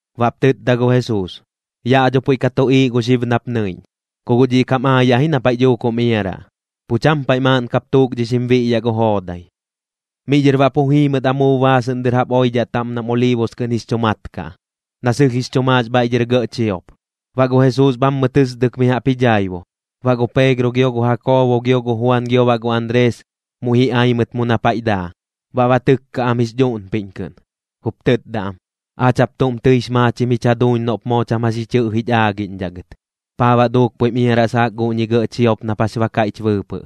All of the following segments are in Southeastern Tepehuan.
Baꞌp tɨtda gu Jesuus: ―Yaꞌ dho puiꞌ ka tuꞌiiꞌ gu xib nap nɨiꞌñ. Ku guꞌ dhiꞌ kam aayaꞌ ji na paiꞌ dhuuk jum iaraꞌ, pu cham paiꞌ maaꞌn kap tukdhixim biꞌyaꞌ gu joodai. Miꞌ dhɨr baꞌ pu jii mɨt amuub baasɨꞌn dɨr jaꞌp oidhaꞌ taꞌm nam Oliibus kɨꞌn jix chu mat kaꞌ, na sɨlh jix chu maax bhaiꞌ dhɨr gɇꞌ chiop. Baꞌ gu Jesuus bhammɨ tɨsdɨk mi jaꞌp ji dhaibu. Baꞌ gu Peegro gio gu Jakoobo gio gu Juan gio baꞌ gu Anrees, muiꞌ ji ai mɨt mu na paiꞌ daa, baꞌ ba tɨkka am jix dhuꞌnpiꞌñ kɨꞌn, jup tɨtda am: ―Aach jaꞌp tuꞌm tɨix maachim jich jaduuñ noꞌp moo cham jax ji chɨꞌjich aagiꞌñdhaꞌ gɨt. ¿Paa baꞌ duuk puiꞌm iaraꞌ saak guꞌñi gɇꞌ chiop nap jax ba kaiꞌch bɨɨpɨꞌ?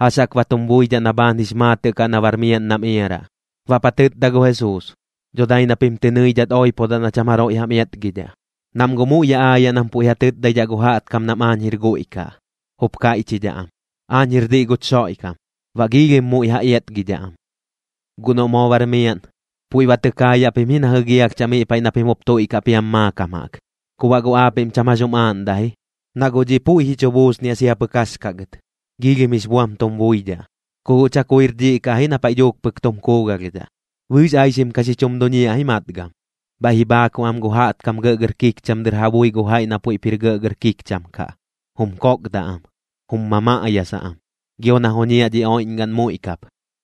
¿Jax jaꞌk ba tum buidhaꞌ na bhaan jix maatɨꞌ kaꞌ na bar miaꞌn nam iaraꞌ? Baꞌp ja tɨtda gu Jesuus: ―Dho dai na pim tɨ nɨidhat oipodaꞌ na cham jaroiꞌ jam iatgidhaꞌ. Nam guꞌ muiꞌ yaꞌ aayaꞌ nam puiꞌ ja tɨtdaidhaꞌ gu jaꞌtkam nam aañ jir guiꞌ kaꞌ, jup kaiꞌchidhaꞌ am: “Aañ jir diꞌ guch Xoiꞌkam.” Baꞌ giilhim muiꞌ ja iatgidhaꞌ am. ’Guꞌ noꞌ moo bar miaꞌn, puiꞌ ba tɨ kaayaꞌ pim ji na jɨgialhchaꞌ miꞌ paiꞌ na pim jup tuiꞌkaꞌ piam maakam jaꞌk. Ku baꞌ guꞌ aapiꞌm cham jax jum aaꞌndaꞌ ji, na guꞌ dhiꞌ puiꞌ ji chu buusniaꞌ sia pɨk jax kaꞌ gɨt, giilhim jix buam tum buidhaꞌ, ku guꞌ chakuir dhiꞌ kaꞌ ji na paiꞌ dhuuk pɨk tum kuugalhdhaꞌ. Bɨɨx aixim ka xi chum duñiaꞌ ji matgam. Bhaiꞌ ji bhaakuꞌ am gu jaꞌtkam gɇꞌgɇr kikcham dɨr ja bui gu jaiꞌ na puiꞌp jir gɇꞌgɇr kikcham kaꞌ, jum kokdaꞌ am, jum mamaꞌyasaꞌ am. Gio na joñiaꞌ dhi oiꞌñgaꞌn muiꞌ kap,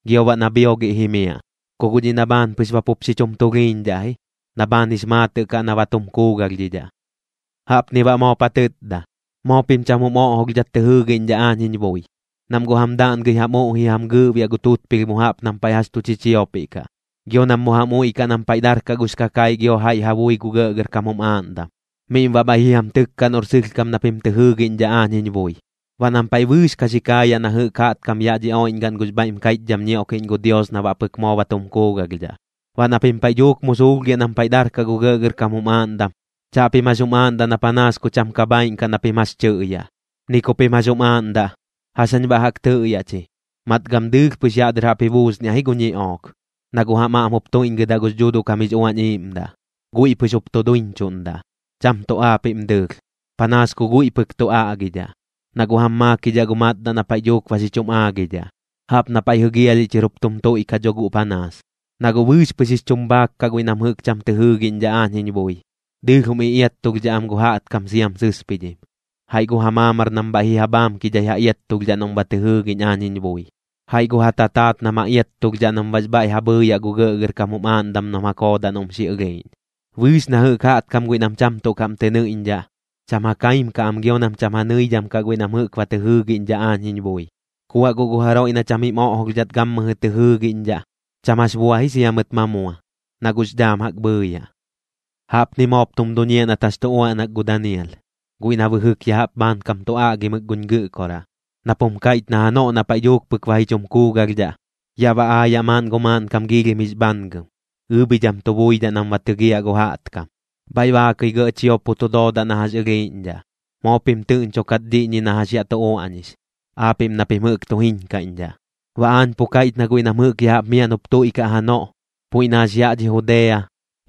gio baꞌ na bhiogiꞌ jimiaꞌ. Ku guꞌ dhiꞌ na bhaan pɨx ba pup xi chum tulhiiñdhaꞌ ji, na bhaan jix maatɨꞌ kaꞌ na ba tum kuugalhdhidhaꞌ. Jaꞌpni baꞌ moop ja tɨtda: ―Moo pim cham jum oꞌjolhdhat tɨ jɨɨgiꞌñdhaꞌ aañ jiñ bui. Nam guꞌ jam daꞌngɨi jam uꞌji jam gɨɨꞌbiaꞌ gu tutpilh mu jaꞌp nam paiꞌ jax tu chichiopiꞌ kaꞌ. Gio nam mu jam uiꞌkaꞌ nam paiꞌ darkaꞌ gux kakaiꞌ gio jaiꞌ ja bui gu gɇꞌgɇrkam jum aaꞌndam, miꞌm baꞌ bhaiꞌ ji jam tɨkkaꞌ noꞌr sɨlhkam na pim tɨ jɨɨgiꞌñdhaꞌ aañ jiñ bui. Baꞌ nam paiꞌ bɨɨx ka xi kaayaꞌ na jɨꞌk jaꞌtkam yaꞌ dhi oiꞌñgaꞌn gux bhaiꞌm kaiꞌchdham ñioꞌkiꞌñ gu Dios na baꞌ pɨk moo ba tum kuugalhdhaꞌ. Baꞌ na pim paiꞌ dhuuk mu suulhgiaꞌ nam paiꞌ darkaꞌ gu gɇꞌgɇrkam jum aaꞌndam, chaꞌpim jax jum aaꞌndaꞌ na panaas ku cham ka bhaaiꞌn kaꞌ na pim jax tɨꞌyaꞌ, ni ku pim jax jum aaꞌndaꞌ: “¿Jax jañ baꞌ jaꞌk tɨꞌyaꞌ chi?” Matgam dɨɨlh pɨx yaꞌ dɨr jaꞌp ji buusniaꞌ ji gu ñiꞌook, na guꞌ jam aꞌm jup tuiꞌñgɨdaꞌ gux Dhuuduꞌ kam jix Uañ Iiꞌmdaꞌ. Guiꞌ pɨx jup tu duiñchuꞌndaꞌ, cham tuꞌ aapiꞌm dɨɨlh, panaas ku guiꞌ pɨk tu aꞌgidhaꞌ, na guꞌ jam maakidhaꞌ gu matdaꞌ na paiꞌ dhuuk ba xi chum aagidhaꞌ. Jaꞌp na paiꞌ jigialhiꞌ chɨr jup tum tuiꞌkaꞌ dho guꞌ panaas, na guꞌ bɨɨx pɨx jix chum bhaak kaꞌ guiꞌ nam jɨꞌk cham tɨ jɨɨgiꞌñdhaꞌ aañ jiñ bui. Dɨɨlh jum iꞌiattulhdhaꞌ am gu jaꞌtkam siam sɨspidhim, jaiꞌ gu ja maamar nam bhaiꞌ ji ja bhaamkidhai ja iattulhdhaꞌ noꞌm ba tɨ jɨɨgiꞌñ aañ jiñ bui, jaiꞌ gu ja tataat nam ja iattulhdhaꞌ nam baꞌx bhaiꞌ ja bhɨɨyaꞌ gu gɇꞌgɇrkam jum aaꞌndam nam ja koodaꞌ noꞌm xi ɨlhiiꞌñ. Bɨɨx na jɨꞌk jaꞌtkam guiꞌ nam cham tuꞌ kaꞌm tɨ nɨiꞌñdhaꞌ, cham ja kaim kaꞌ am gio nam cham ja nɨidham kaꞌ guiꞌ nam jɨꞌk ba tɨ jɨɨgiꞌñdhaꞌ aañ jiñ bui. Ku baꞌ guꞌ gu jaroiꞌ na cham jim oꞌjolhdhat gammɨjɨ tɨ jɨɨgiꞌñdhaꞌ, cham jax bua ji sia mɨt ma mua, na guꞌx dhaam jaꞌk bhɨɨyaꞌ. ’Jaꞌpni moop tum duñiaꞌ nat jax tu uaꞌnak gu Danial, guiꞌ na bɨjɨk ya jaꞌp bhaankam tu aꞌgimɨk guñ Gɨꞌkoraꞌ, nap jum kaiꞌch na janoꞌ na paiꞌ dhuuk pɨk ba ji chum kuugalhdhaꞌ, yaꞌ ba aayaꞌ maaꞌn gu maaꞌnkam giilhim jix bhangɨm, ɨɨbhidham tu buidhaꞌ nam ba tɨgiaꞌ gu jaꞌtkam. Bhaiꞌ baakɨi gɇꞌ chiop pu tu doodaꞌ na jax ɨlhiiꞌñdhaꞌ. ―Moo pim tɨꞌñchukat dhiꞌñi na jax yaꞌ tu uaꞌñix, aapiꞌm na pim jɨꞌk tu jiñkaiꞌñdhaꞌ―. Baꞌ aañ pu kaiꞌch na guiꞌ nam jɨꞌk ya jaꞌp miaꞌn jup tuiꞌkaꞌ janoꞌ, puiꞌ na jax yaꞌ dhi Judea,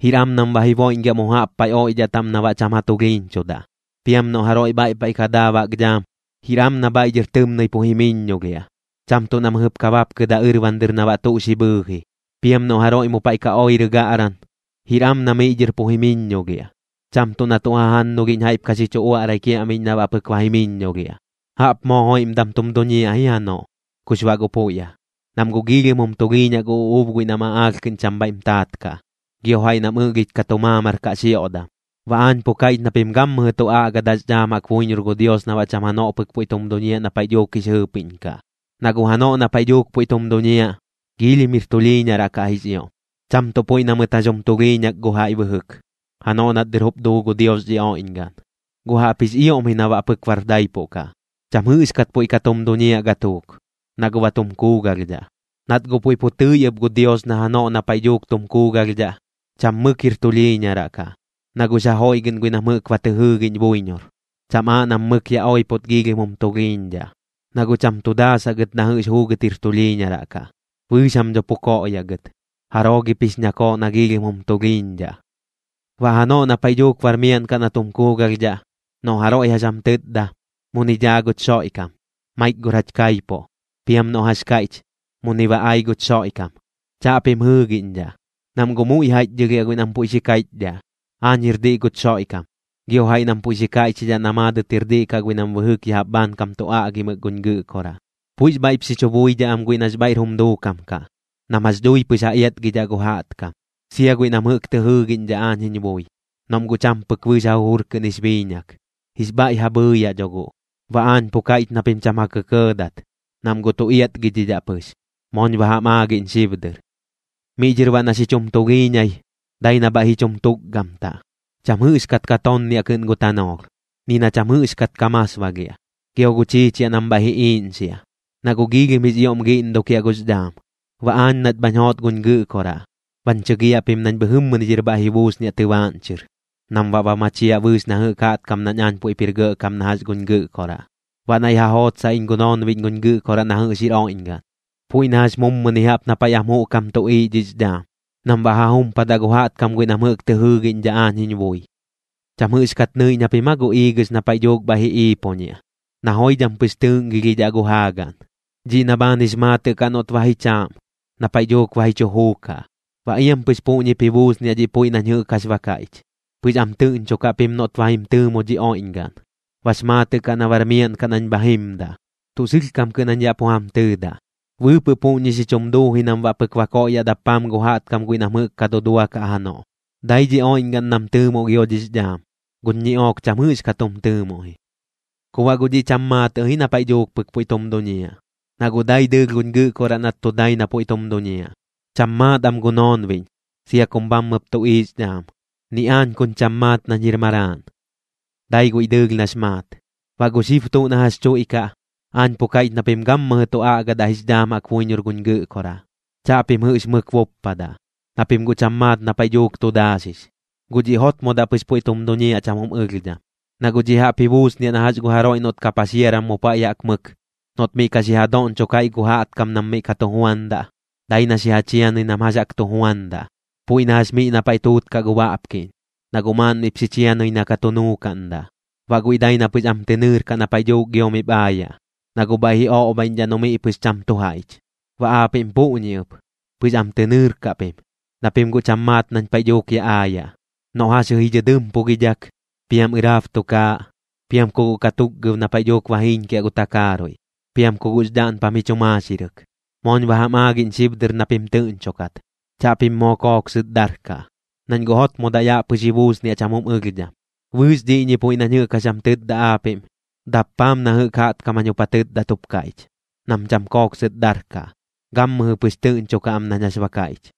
jir am nam ba ji boiꞌñgiaꞌ mu jaꞌp paiꞌ oiꞌdhaꞌ taꞌm na baꞌ cham ja tulhiiñchudaꞌ. Piam noꞌ jaroiꞌ bhaiꞌ paiꞌ ka daa baꞌk dhaam, jir am na bhaiꞌ dhɨr tɨmnɨi pu jimɨiññolhiaꞌ, cham tuꞌ na mɨjɨp ka bapkɨdaꞌ ɨrban dɨr na baꞌ tuꞌ xi bhɨɨji. Piam noꞌ jaroiꞌ mu paiꞌ ka oirɨ gaꞌran, jir am na miꞌ dhɨr pu jimɨiññolhiaꞌ, cham tuꞌ na tuꞌ jajannulhiꞌñ jaiꞌp ka xi chu uaꞌrai kiaꞌmiꞌñ na baꞌ pɨk ba jimɨiñolhiaꞌ. ¡Jaꞌp moo joiꞌmdam tum duñiaꞌ ji janoꞌ, kux baꞌ guꞌ puiꞌ aa! Nam guꞌ giilhim jum tulhiiñaꞌ gu uꞌuub guiꞌ nam aꞌaalh kɨꞌn cham bhaiꞌm taat kaꞌ, gio jaiꞌ nam ɨꞌlhich ka tu maamar kaꞌ xioꞌdam. Baꞌ aañ pu kaiꞌch na pim gammɨjɨ tu aꞌgadaꞌx dhaam jaꞌk buiñor gu Dios na baꞌ cham janoꞌ pɨk puiꞌ tum duñiaꞌ na paiꞌ dhuuk jix jɨɨpiꞌñ kaꞌ. Na guꞌ janoꞌ na paiꞌ dhuuk puiꞌ tum duñiaꞌ, giilhim jir tulhiiñaraꞌ kaꞌ jix ioꞌm, cham tuꞌ puiꞌ na mɨt jax jum tulhiiñak gu jaiꞌ bɨjɨk, janoꞌ nat dɨr jup duu gu Dios dhi oiꞌñgaꞌn. Guꞌ jaꞌpji jix ioꞌm ji na baꞌ pɨk bar daipuꞌ kaꞌ, cham jɨꞌxkat puiꞌ ka tum duñiaꞌ gatuuk, na guꞌ ba tum kuugalhdhaꞌ. Nat guꞌ puiꞌ pu tɨi ɨp gu Dios na janoꞌ na paiꞌ dhuuk tum kuugalhdhaꞌ, cham mɨk jir tulhiiñaraꞌ kaꞌ, na guꞌx ja joiꞌgɨꞌn guiꞌ nam jɨꞌk ba tɨ jɨɨgiꞌñ buiñor, cham aaꞌ nam mɨk yaꞌ oipot giilhim jum tulhiiñdhaꞌ. Noꞌ guꞌ cham tu daasaꞌ gɨt na jɨꞌx juugɨt jir tulhiiñaraꞌ kaꞌ, bɨɨx jam dho pu koꞌyaꞌ gɨt. ¿Jaroo gip jix ñakooꞌ na giilhim jum tulhiiñdhaꞌ? ’Baꞌ janoꞌ na paiꞌ dhuuk bar miaꞌn kaꞌ na tum kuugalhdhaꞌ, noꞌ jaroiꞌ jax jam tɨtda: “Muni dhaa guch Xoiꞌkam. Maik gor jach kaipuꞌ”, piam noꞌ jax kaiꞌch: “Muni ba ai guch Xoiꞌkam”, chaꞌpim jɨɨgiꞌñdhaꞌ. Nam guꞌ muiꞌ jaiꞌchdhɨlhiaꞌ guiꞌ nam puiꞌ xi kaiꞌchidhaꞌ: “Aañ jir diꞌ guch Xoiꞌkam”, gio jaiꞌ nam puiꞌ xi kaiꞌchidhaꞌ na maadɨt jir diꞌ kaꞌ guiꞌ nam bɨjɨk ya jaꞌp bhaankam tu aꞌgimɨk guñ Gɨꞌkoraꞌ. Puiꞌx bhaiꞌp xi chu buidhaꞌ am guiꞌ nax bhaiꞌr jum duukam kaꞌ, nam jax dhui pɨx ja iatgidhaꞌ gu jaꞌtkam, sia guiꞌ nam jɨꞌk tɨ jɨɨgiꞌñdhaꞌ aañ jiñ bui. Noꞌm guꞌ cham pɨk bɨɨx ja jujur kɨꞌn jix biiñak, jix bhaiꞌ ja bhɨɨyaꞌ dho guꞌ. Baꞌ aañ pu kaiꞌch na pim cham ja kɇkɇɇdat, nam guꞌ tu iatgidhidhaꞌ pɨx. Mooñ ba jam aagiꞌñ xib dɨr. ’Miꞌ dhɨr baꞌ na xi chum tulhiiñai, dai na bhaiꞌ ji chum tukgamtaꞌ. Cham jɨꞌxkat ka tonniaꞌ kɨꞌn gu tanoolh, ni na cham jɨꞌxkat ka masbagiaꞌ. Gio gu chiichiaꞌ nam bhaiꞌ ji iiꞌñxiaꞌ, na guꞌ giilhim jix ioꞌm giꞌndukiaꞌ gux dhaam. Baꞌ aañ nat bhañ joot guñ Gɨꞌkoraꞌ, bañ chɨgiaꞌ pim nañ bhɨjɨmmɨni dhɨr bhaiꞌ ji buusniaꞌ tɨbaaꞌñ chɨr, nam baꞌ ba machiaꞌ bɨɨx na jɨꞌk jaꞌtkam nañ aañ puiꞌp jir gɇꞌkam na jax guñ Gɨꞌkoraꞌ. Baꞌ naiꞌ ja jootsaꞌ iñ gu noonbiꞌñ guñ Gɨꞌkoraꞌ na jɨꞌx jir oiꞌñgaꞌn, puiꞌ na jax mummɨni jaꞌp na paiꞌ am juꞌkam tuꞌiiꞌ dhix dhaam, nam baꞌ ja jumpadaꞌ gu jaꞌtkam guiꞌ nam jɨꞌk tɨ jɨɨgiꞌñdhaꞌ aañ jiñ bui. ’¿Cham jɨꞌxkat nɨiꞌñ japim aa gu iigɨx na paiꞌ dhuuk bhaiꞌ ji iipoñiaꞌ, na joidham pɨx tɨɨꞌngilhidhaꞌ gu jaagaꞌn? Dhiꞌ na bhaan jix maatɨꞌ kaꞌ noꞌt ba ji chaaꞌm, na paiꞌ dhuuk ba ji chu juukaꞌ. Baꞌ iam pɨx puꞌñip ji buusniaꞌ dhiꞌ puiꞌ nañ jɨꞌk jax ba kaiꞌch. Pɨx am tɨꞌñchukaꞌ pim noꞌt ba jim tɨɨmu dhi oiꞌñgaꞌn, bax maatɨꞌ kaꞌ na bar miaꞌn kaꞌ nañ bha jimdaꞌ. Tuꞌ sɨlhkam kɨꞌn jañ yaꞌ pu jam tɨɨda, bɨɨpɨꞌ puꞌñi xi chum duuji nam baꞌ pɨk ba koꞌyaꞌ dappaam gu jaꞌtkam guiꞌ nam jɨꞌk ka duduakaꞌ janoꞌ. Dai dhi oiꞌñgaꞌn nam tɨɨmuꞌ gio gux dhaam, guꞌ guñ ñiꞌook cham jɨꞌxkat jum tɨɨmuꞌ ji. ’Ku baꞌ guꞌ dhiꞌ cham maatɨꞌ ji na paiꞌ dhuuk pɨk puiꞌ tum duñiaꞌ, na guꞌ dai dɨɨlh guñ Gɨꞌkoraꞌ nat tu dai na puiꞌ tum duñiaꞌ. Cham maat am gu noonbiꞌñ, sia kum bhammɨp tuꞌiiꞌx dhaam, ni aañ kuñ cham maat nañ jir Maraaꞌn, dai guiꞌ dɨɨlh nax maat. ’Baꞌ gu xib tuꞌ na jax chuiꞌkaꞌ, aañ pu kaiꞌch na pim gammɨjɨ tu aꞌgadaꞌ jix dhaam jaꞌk buiñor guñ Gɨꞌkoraꞌ, chaꞌpim jɨꞌx mɨk buppadaꞌ, na pim guꞌ cham maat na paiꞌ dhuuk tu daaxix. Guꞌ dhiꞌ jotmodaꞌ pɨx puiꞌ tum duñiaꞌ cham jum ɨlhdham. Na guꞌ dhiꞌ jaꞌp ji buusniaꞌ na jax gu jaroiꞌ noꞌt ka paxiaram mu paiꞌ jaꞌk mɨk, noꞌt miꞌ ka xi ja doꞌñchok jaiꞌ gu jaꞌtkam nam miꞌ ka tu juandaꞌ, dai na xi ja chianɨi nam jax jaꞌk tu juandaꞌ, puiꞌ na jax miꞌ na paiꞌ tuutkaꞌ gu baꞌpkiꞌñ, na guꞌ maaꞌn miꞌp xi chianɨi na ka tu nuukaꞌndaꞌ. Baꞌ guiꞌ dai na pɨx am tɨ nɨɨrkaꞌ na paiꞌ dhuuk gio miꞌp aayaꞌ, na guꞌ bhaiꞌ ji oꞌbhaiꞌñdhaꞌ noꞌ miꞌ pɨx cham tu jaiꞌch. Baꞌ aapiꞌm puꞌñi ɨp, pɨx am tɨ nɨɨrkaꞌ pim, na pim guꞌ cham maat nañ paiꞌ dhuuk yaꞌ aayaꞌ, noꞌ jaxjɨ ji dhɨdɨmpugidhak, piam ɨrab tukaaꞌ, piam ku guꞌ katukgab na paiꞌ dhuuk ba jiiñkiaꞌ gu takaaruiꞌ, piam ku guꞌx dhaꞌnpam ji chu maaxirɨk. Mooñ ba jam aagiꞌñ xib dɨr na pim tɨꞌñchukat. Chaꞌpim moo kooksɨt darkaꞌ, nañ guꞌ jotmodaꞌ yaꞌ pɨx ji buusniaꞌ cham jum ɨlhdham. Bɨɨx dhiꞌñi puiꞌ nañ jɨꞌk jax jam tɨtda aapiꞌm, dappaam na jɨꞌk jaꞌtkam jañ jup ja tɨtdat jup kaiꞌch: Nam cham kooksɨt darkaꞌ, gammɨjɨ pɨx tɨꞌñchukaꞌ am nañ jax ba kaiꞌch.